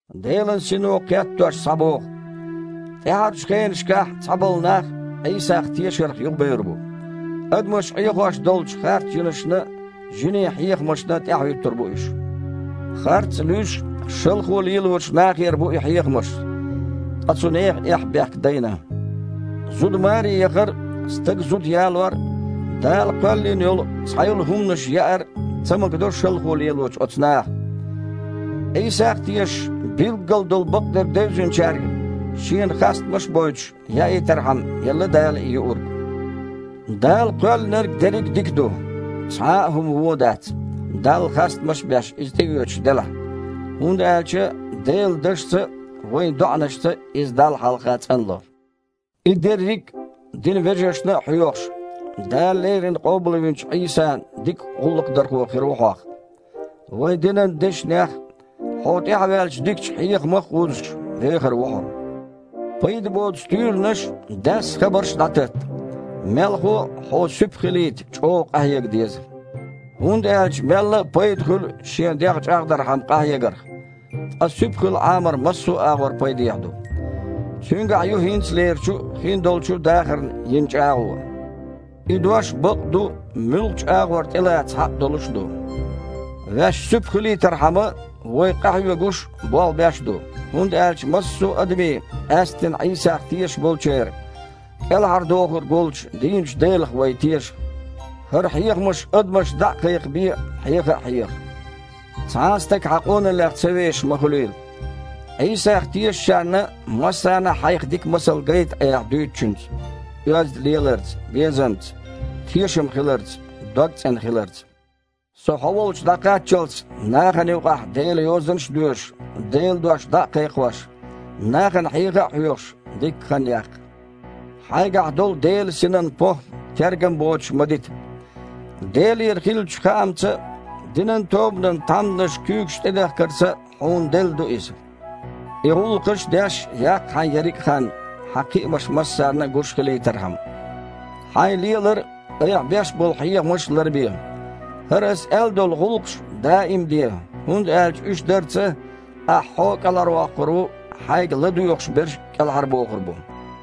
Делан Сино кхеттош схьабоху: тІаьхьарчу хенашкахь цхьаболу нах Іийсах тешарх юхабевр бу. Адамаш Іехош долчу харцжинашна а, жинийн хьехамашна а тІаьхьахІуьттур бу уьш. Харц а луьйш, шалхо лелочу нахера бу и хьехамаш. Ткъа цу нехан эхь-бехк дайна. Зуда маре яхар а, стага зуда ялор а, Дала кхоьллина йолу цхьайолу хІуманаш яар а ца магадо шалхо лелочу оцу наха. Іийсах а тешаш, билггал долу бакъдерг девзинчаьрга, Шена хастамаш а бойтуш, яийтархьама, елла Дала и юург. Дала кхоьллинарг дерриг а дика ду. Цхьа а хІума вон дац, Далла хастамаш а беш, иза тІеоьцуш делахь, хІунда аьлча Делан дашца а, вайн доІанашца а иза Далла хьалха цІанло. И дерриг а динан вежаршна а хьоьхуш, Дала леррина къобалвинчу Іийсан дика гІуллакхдархо хир ву хьох. Вайн динан дешнех а, хьо тІаьхьаваьллачу дикачу хьехамах а вузуш, вехар ву хьо. Пайда боцу туьйранаш а, даьсса хабарш а дІататта. Мелхо а, хьо суьпа хилийта чІогІа къахьега деза. ХІунда аьлча мелла а пайда хуьлу шен дегІ чІагІдархьама къахьегарх, ткъа суьпа хила Іамар массо а агІор пайдехьа ду. Цуьнгахь ю хІинцалерчу а, хиндолчу а дахарна йина чІагІо. И дош бакъ а ду, муьлххачу а агІор тІелаца хьакъ долуш а ду. Ваьш суьпа хилийтархьама, вай къахьоьгуш а, болх беш а ду. ХІунда аьлча массо а адамийн, къаьсттина Іийсах тешаш болчеран, КІелхьардохург волчу дийначу Делах вай теша. ХІара хьехамаш адамашна дІа а кхайкхабе, хьеха а хьеха. Цхьа а стаг хьан къоналлех ца вешаш ма хуьлийла. Іийсах тешачарна массарна а хьайх дика масал гайта айхьа дуьйцучуьнца, оьзда леларца, безамца, тешам хиларца, дог цІена хиларца. Со хьо волчу дІакхаччалц, нахана юкъахь Делан Йозанаш а доьшуш, Делан дош дІа а кхайкхош, нахана хьеха а хьоьхуш, дикка хан яккха. Хьайгахь долу Делан Синан похІма тергам боцуш ма дита. Делера хиллачу хаамца а, динан тобанан тхьамданаша куьйгаш тІедахкарца а хьуна делла ду иза. И гІуллакхаш а деш, яккха хьайн ерриг а хан, хьан кхиамаш массарна а гуш хилийтархьама. Хьайн лелар а, айхьа беш болу хьехамаш а ларбе. ХІара ас аьлла долу гІуллакхаш даим а де, хІунда аьлча уьш дарца ахьа хьо а кІелхьарвоккхур ву, хьайга ладоьгІуш берш а кІелхьарбохур бу.